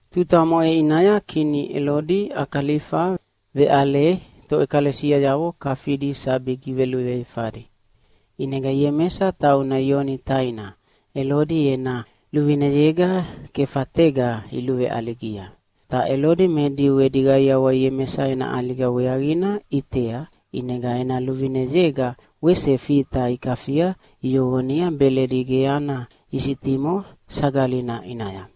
Tuta omoʼe ʼinaya kini Elodi Akalifa veʼale toʼekalesiayavo kafidi sabi giveluveifadi. ʼInega Iemesa, tauna Ioni taina, Elodi ena luvineyega kefatega iluveʼaligia. Ta Elodi me Diu edi qaiawa Iemesa ena ʼaliga weaqina ʼitea, ʼinega ena luvineyega wese Fita ikafia iyoqonia Beledi ge ana isitimo Sagalina ʼinaya.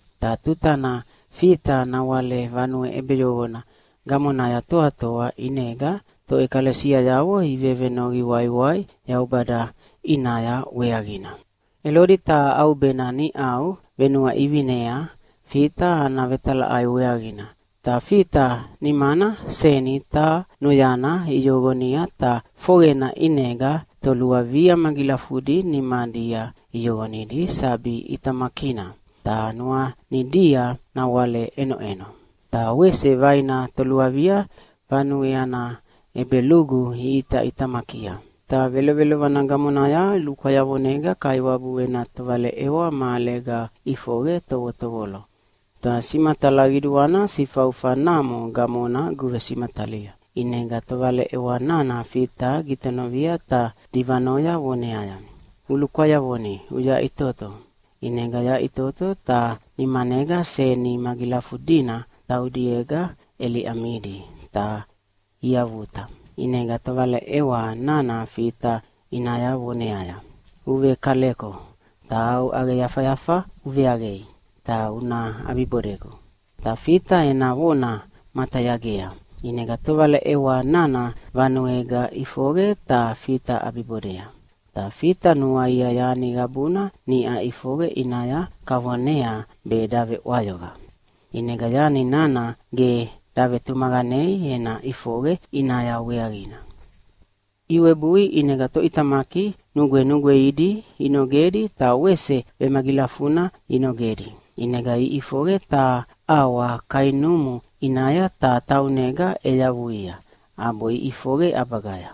Ta tutana Fita nawale vanue ʼebeyoqona gamonaya toatoa, ʼinega toʼekalesiayavo ivevenoqi waiwai Yaubada ʼinaya weaqina. Elodi taha ʼaubena niʼau venuaʼivinea Fita ana vetalaʼai weaqina. Ta Fita nimana seni taha noyana iyoqonia ta foqena ʼinega toluavia magilafudi nimadia iyoqonidi sabi ʼitamakina, ta nuanidia nawale ʼenoʼeno. Ta wese vaina toluavia vanue ana ʼebelugu iʼitaʼitamakia. Ta velovelovana gamonaya lukwayavonega Kaiwabu ena tovaleʼewa mahalega ʼifoqe tovotovolo, ta simatala qiduana sifaufa namo gamona guvesimatalia. ʼInega tovaleʼewa nana Fita gitonovia ta divanoya voneaya, “Ulukwayavoni uyaʼitoto!” ʼInega yaʼitoto ta nimanega seni magilafudina taudiega ʼeliʼamidi ta iavuta. ʼInega tovaleʼewa nana Fita ʼinaya voneaya, “Uvekaleko ta au ʼaqeyafayafa uveʼaqei ta una ʼabibodegu!” Ta Fita ena vona matayagea. ʼInega tovaleʼewa nana vanuega ʼifoqe ta Fita ʼabibodea. Ta Fita nuaia yani qabuna niʼa ʼifoqe ʼinaya kavonea be daveʼwayoqa, ʼinega yani nana ge davetumaqanei ena ʼifoqe ʼinaya weaqina. Iwebui ʼinega toʼitamaki nugwenugweidi inogedi ta wese vemagilafuna inogedi. ʼInega iʼifoqe taha ʼawa kainumu ʼinaya, ta taunega ʼeyavuia, ʼabo iʼifoqe ʼabagaya.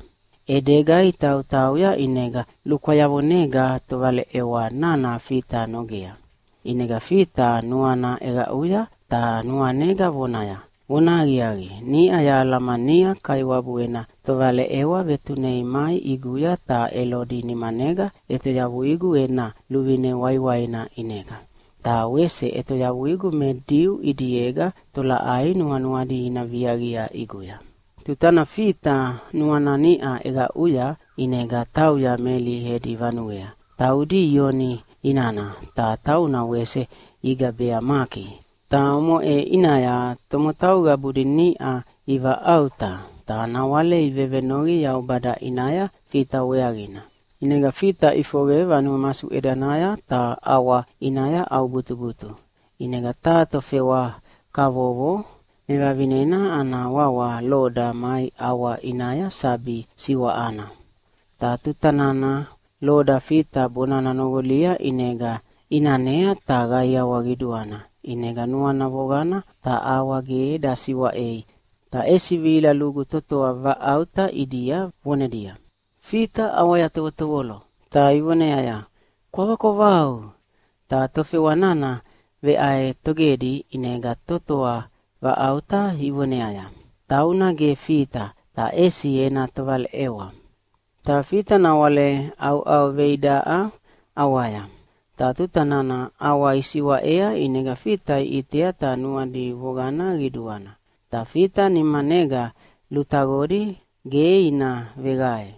ʼEdega itautauya ʼinega lukwayavonega tovaleʼewa nana Fita nogea. ʼInega Fita nuana ʼeqaʼuya ta nuanega vonaya, “Vonahaqiaqi, niʼa yahalamania Kaiwabu ena tovaleʼewa vetunei mai ʼiguya ta Elodi nimanega ʼetoyavuigu ena luvine waiwaina ʼinega, ta wese ʼetoyavuigu me Diu ʼidiega tolaʼai nuanuadi ina viaqia ʼiguya.” Tutana Fita nuana niʼa ʼeqaʼuya, ʼinega tauya Meli edi vanuea, taudi Ioni inana, ta tauna wese igabea Maki. Ta omoʼe ʼinaya tomotau qabudi niʼa ivaʼauta, ta nawale ivevenoqi Yaubada ʼinaya Fita weaqina. ʼInega Fita ʼifoqe vanue masuʼedanaya ta ʼawa ʼinaya ʼaubutubutu. ʼInega taha tofewa kavovo mevavinena ana wawa Loda mai ʼawa ʼinaya sabi siwaʼana. Ta tuta nana Loda Fita bonana noqolia, ʼinega ʼinanea ta qaiawa qiduana, ʼinega nuana voqana ta ʼawa ge dasiʼwaei, ta ʼesi vihila lugu totoa vaʼauta ʼidia vonedia, “Fita ʼawaya tovotovolo!” Ta ivoneaya, “Kwavakwavau!” Ta tofewa nana veʼaetogedi ʼinega totoa vaʼauta ivoneaya, “Tauna ge Fita, ta ʼesi ena tovaleʼewa.” Ta Fita nawale ʼauʼauveidaʼa ʼawaya. Ta tuta nana ʼawa isiwaʼea ʼinega Fita iʼitea ta nuadi voqana qiduana. Ta Fita nimanega lutaqodi ge ina veqae.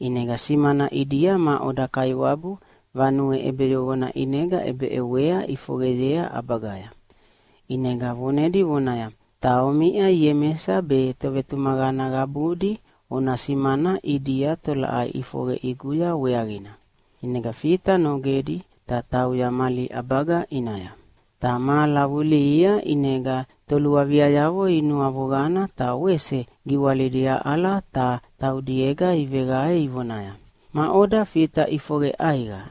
ʼInega simana ʼidia maʼoda Kaiwabu vanue ʼebeyoqona ʼinega ʼebeʼewa ʼifoqeyea ʼabagaya. ʼInega vonedi vonaya, “Ta omiʼa Iemesa be tovetumaqana qabudi ona simana ʼidia tolaʼai ʼifoqe ʼiguya weaqina.” ʼInega Fita nogedi ta tauya mali ʼabaga ʼinaya. Ta mahala vulihia ʼinega toluaviayavo inuavoqana ta wese giwalidi aʼala ta taudiega iveqae ivonaya, “Maʼoda Fita ʼifoqe ʼaiqa?”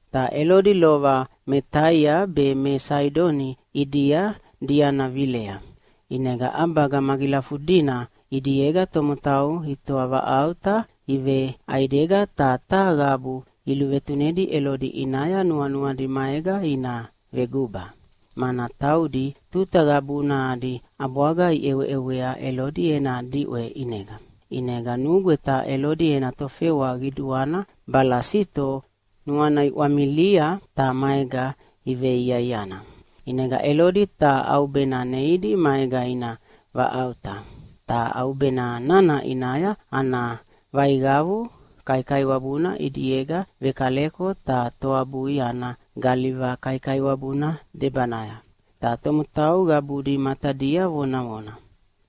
Ta Elodi lova me Taia be me Saidoni ʼidia diana vilea. ʼInega ʼabaga magilafudina ʼidiega tomotau itoavaʼauta iveʼaidega ta taha qabu iluvetunedi Elodi ʼinaya nuanuadi maega ina veguba. Mana taudi tuta qabuna adi ʼabwaga iʼeweʼewea Elodi ena diʼwe ʼinega. ʼInega nugweta Elodi ena tofewa qiduana Balasito nuana iʼwamilia ta maega iveiaiana. ʼInega Elodi taha ʼaubena neidi maega ina vaʼauta. Ta ʼaubena nana ʼinaya ana vaiqavu kaikaiwabuna ʼidiega vekaleko ta toabui ana galiva kaikaiwabuna debanaya. Ta tomotau qabudi matadia vonavona.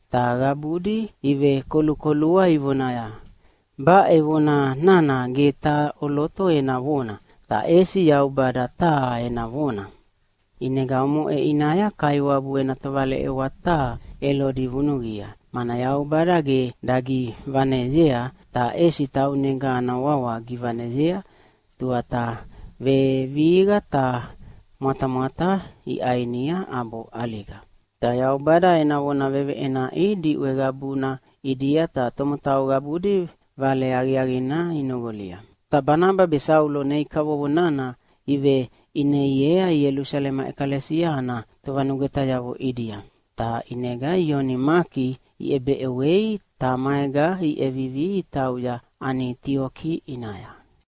Ta qabudi ivekolukolua ivonaya, “Baʼe vona nana ge taha ʼoloto ena vona, ta ʼesi yaubada taha ena vona.” ʼInega omoʼe ʼinaya Kaiwabu ena tovaleʼewa taha Elodi vunuqia, mana Yaubada ge dagivaneyea ta ʼesi taunega ana wawa givaneyea, tuata vevihiqa ta mwatamwata iʼainia ʼabo ʼaliga. Ta Yaubada ena vona veveʼenaʼi diʼwe qabuna ʼidia ta tomotau qabudi Vale Aqiaqina inoqolia. Ta Banaba be Saulo nei kavovo nana iveʼineiea Ielusalema ʼekalesia ana tovanugwetayavo ʼidia. Ta ʼinega Ioni Maki iʼebeʼewei ta maega iʼevivi itauya Anitioki ʼinaya.